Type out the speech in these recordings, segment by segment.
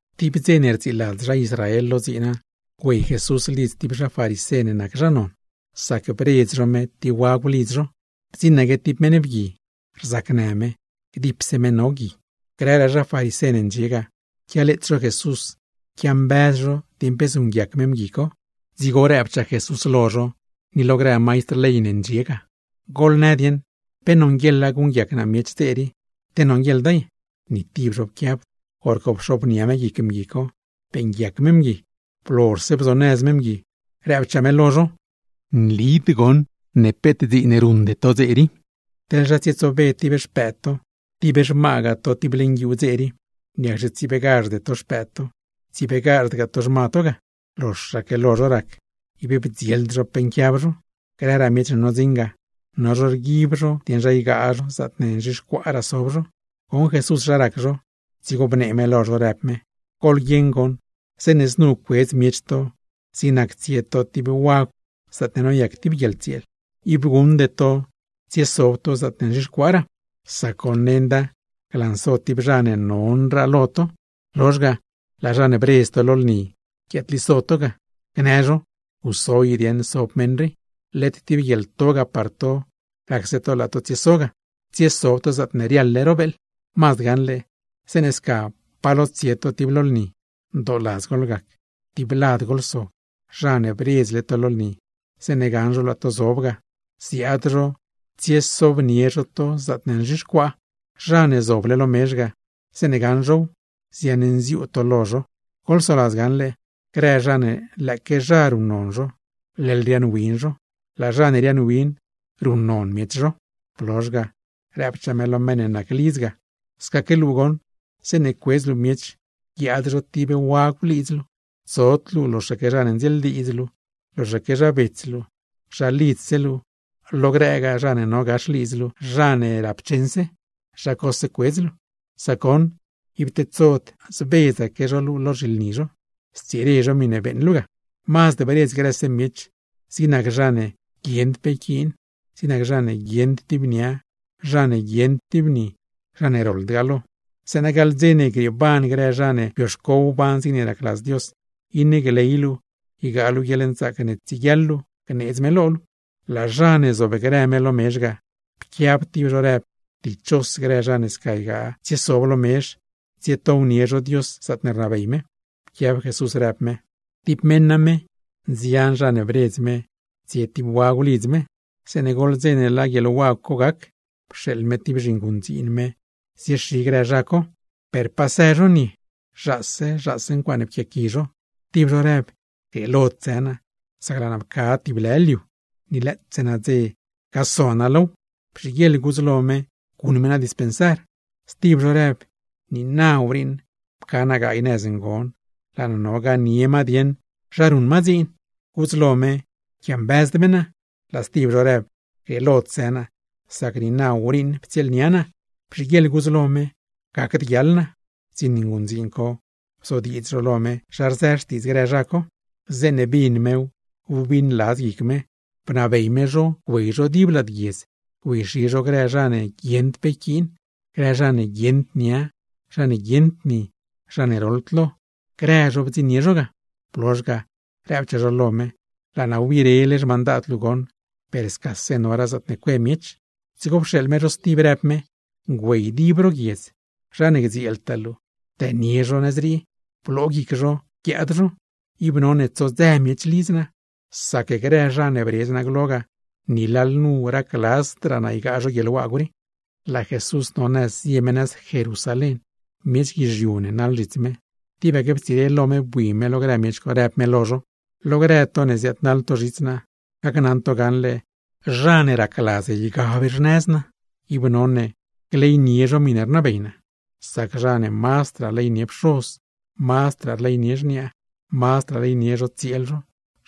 Tib dze ne rdziiladz zha Israel lo dziina, güey Jesús lidz tib zha farisé ne nac zha non, sac bredz zho me tib wagw lidz zho. Bdziṉaque tib meṉ bgui, rzacnë me, gdipse me no gui. Grëraa zha farisé ne ndxie ga, quialeets zho Jesús quiambëz zho dieṉ pe zuṉguiac me mgui co. Dzigo rëbchaa Jesús lo zho, ni lo grë maistr ley ne ndxie ga: ―Goḻnë dieṉ, ¿pe nonguieḻa guṉguiac naa miech dze rii, te nonguieḻda ye? Ni tib zho pquiabd. Horco pxobnia me guic mgui co, beeṉguiac me mgui. Blozhse bzonëz me mgui, rëbchaa me lo zho: ―¿Pe nli na peet dziin ruṉde to dze rii? Teḻ zha tsietsobe tib xpëëd to, tib xmagaa to tib leṉ guiuu dze rii, ¿niacxe tsiebeegazhde to xpëëd to, tsiebeegazhdgaa to xma to ga? Loxaque lo zho rac, ib bdzield zho pe nquiab zho. Grëraa miech ne nodziṉ ga, no zho rguib zho dieṉ zha ygaa zho zaatne nzhixcuaaraa sob zho. Goṉ Jesús zha rac zho, dzigo bnee me lo zho, rëb me: ―Goḻguieṉ goṉ, zeeṉe znu cuedz miech to, zig nac tsie to tib wagw zaatne noyac tib guieḻtsieel, ib guṉde tsiesob to zaatne nzhixcuaaraa. Sac goṉ, nenda glanso tib zha ne nonraa lo to, lozh ga, laa zha ne bredz to lo lni guiaadliso to ga, gnë zho: “Guso i dieṉ sob meṉ rii.” Led tib guieḻto ga par to, racse to laa to tsieso ga, tsiesob to zaatne riaḻle ro beeḻ. Mazd gaṉle, zeeṉe sca pa lo tsie to tib lo lni, ndooladz goḻgac, tib lad goḻsob. Zha ne bredzle to lo lni, zeeṉe gaṉ zho laa to zob ga, ziaad zho ziaad-xi zho to tsiesobnie zho to zaatne nzhixcuaa. Zha ne zoble lo mezh ga, zeeṉe gaṉ zhow, ziaṉnziuu to lo zho. Goḻsoladz gaṉle: grë zha ne lëëque zha ruṉnon zho, leḻ riaaṉwin zho; laa zha ne riaaṉwin, ruṉnon miech zho. Blozh ga, rëbchaa me lo meṉ ne nac lidz ga: ―Scaque luu goṉ, zeeṉe cuedz luu miech guiaad zho tib wagw lidz luu, tsod luu loxaque zha ne ndzieeldiidz luu, loxaque zha bets luu, zha lidzse luu, lo grëgaa zha ne no gax lidz luu zha ne rapcheṉse, zha cose cuedz luu; sac goṉ ib tedsod zbedzaque zho luu lo zhilni zho, stsire zho miṉe beeṉ luu ga. Mazd bredz grëse miech, zig nac zha ne guieṉd pe yquiin, zig nac zha ne guieṉd tib nia, zha ne guieṉd tib ni, zha ne roḻdgaa lo; zeeṉa gaḻ dze ne grieeban grë zha ne bioxco wban zigne racladz Dios, iṉe gley luu ygaa luu guieḻnzaac ne tsieguiaḻ luu gneedz me lo luu. Lad zha ne zobgrë me lo mezh ga, pquiab tib zho rëb: ―¡Dichos grë zha ne sca ygaa tsiesob lo mezh, tsietownie zho Dios zaatne rnabey me! Pquiab Jesús rëb me: ―Tib meṉ name, nzian zha ne bredz me tsie tib wagw lidz me. Zeeṉe goḻ dze ne laa guieḻwagw co gac, pxeeḻ me tib zhinguṉdziin me ziexi grë zha co. Per pasë zho nie, zhaase zhaase ncuaaṉe pquiaqui zho. Tib zho rëb: “Grieelod së naa, sac laa naa pca tib lë liu, ni lëëtse nadze no gaso naa low; bzhiguieḻ gudz lo me guṉ me naa dispensar.” Stib zho rëb: “Niina wriiṉ pca naa gaay nëz ngon, laa naa no ganie ma dieṉ zha ruṉ ma dziin, gudz lo me yquiambëzd me naa.” Laa stib zho rëb: “Grieelod së naa, sac niina wriiṉ ptsieelnia naa, bzhiguieḻ gudz lo me gacd guiaḻ naa.” ’Bdziṉ nguṉdziin co bzodiidz zho lo me zha rzë xtiidz grë zha co. Zeeṉe bin mew, wbiṉladz guic me, bnabey me zho güey zho dib lad guiedz güeyxi zho grë zha ne guieṉd pe yquiin, grë zha ne guieṉd nia, zha ne guieṉd ni, zha ne roḻd lo, grëse zho bdziṉnie zho ga. Blozh ga, rëbchaa zho lo me: “Laa naa wbirele xmandad luu goṉ, per scase noraa zaatne cue miech.” Dzigo pxeeḻ me zho stib, rëb me: “Güey dib ro guiedz, zha ne gdzieeltaa luu, dënie zho nëz rii, bloo guic zho guiaad zho; ib none tsodzëse miech lidz naa. Sac grë zha ne bredz naa glo ga, ni lalnu racladzdraa naa ygaa zho guieḻwagw rii.” Laa Jesús no nëz zie me nëz Jerusalén, miech guizhiu ne naḻ zhits me. Tibaque ptsire lo me bui me lo grë miech co, rëb me lo zho: ―Lo grë to ne ziaadnaḻ to zhits naa, gacnaṉ to gaṉle zha ne racladz ygab xnëz naa, ib none gleynie zho miṉe rnabey naa. Sac zha ne mazdraa rleynie pxoz, mazdraa rleynie xniaa, mazdragaa rleynie zho tsieel zho,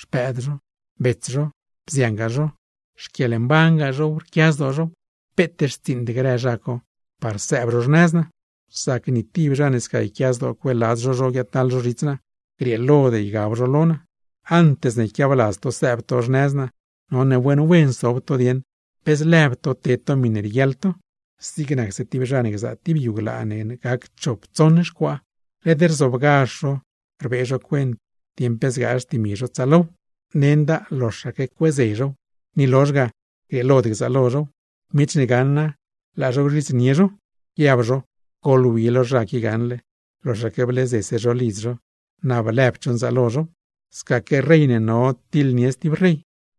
xpëëd zho, bets zho, bziangaa zho, xquieḻmban zhow, rquia zdoo zhow, peet xtsiiṉd grë zha co par sëëb zho xnëz naa. Sac ni tib zha ne sca yquia zdoo cueeladz zho zho guiaadnaḻ zho zhits naa, grieelod ygab zho lo naa. Antes ne yquiabladz to sëëb to xnëz naa, none wen wen sob to dieṉ pe zlëb to ted to miṉe rieguiaḻ to. Zig nacse tib zha ne gzaa tib yu glaa ne gac chop tsoṉ xcuaa, led rzobgazh zho rbee zho cuent dieṉ pe zgaa xtimi zho tsaalow. Sac goṉ nenda loxaque cueeze zhow, ni lozh ga grieelod gzaalo zhow. Miech ne gaṉa laa zho gzhidznie zho, guiab zho: “Goḻwi lo zha qui gaṉle, loxaque bleeze zho lidz zho, na blëbd zho nzaalo zhow.” Scaque rey ne no tiḻnie stib rey,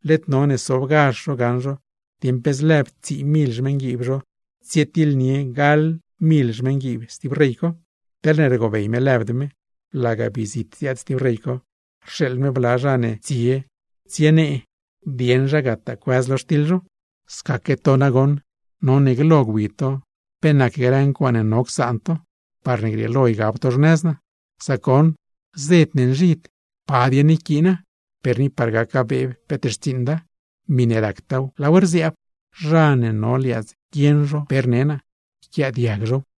led none sobgazh zho gaṉ zho dieṉ pe zlëëb tsii mil xmeṉguiib zho tsietiḻnie gaḻ mil xmeṉguiib stib rey co. Teḻne rgobey me lëbd me, laga bii zit ziaad stib rey co, rxeeḻ me bla zha ne tsie tsienee dieṉ zha gataa cuëz lo xtiḻ zho. ’Scaque to nagoṉ none glo gwi to pe nac grë ncuaaṉe no csaan to, parne grieelo ygab to xnëz naa. Sac goṉ zed ne nzhid, ¿pa dieṉ yquiina? Per ni par gaca beeb peet xtsiiṉda; miṉe ractaaw, laaw rziaab. Zha ne no liaadz guieṉ zho pe rnee naa, yquiaadiag zhow.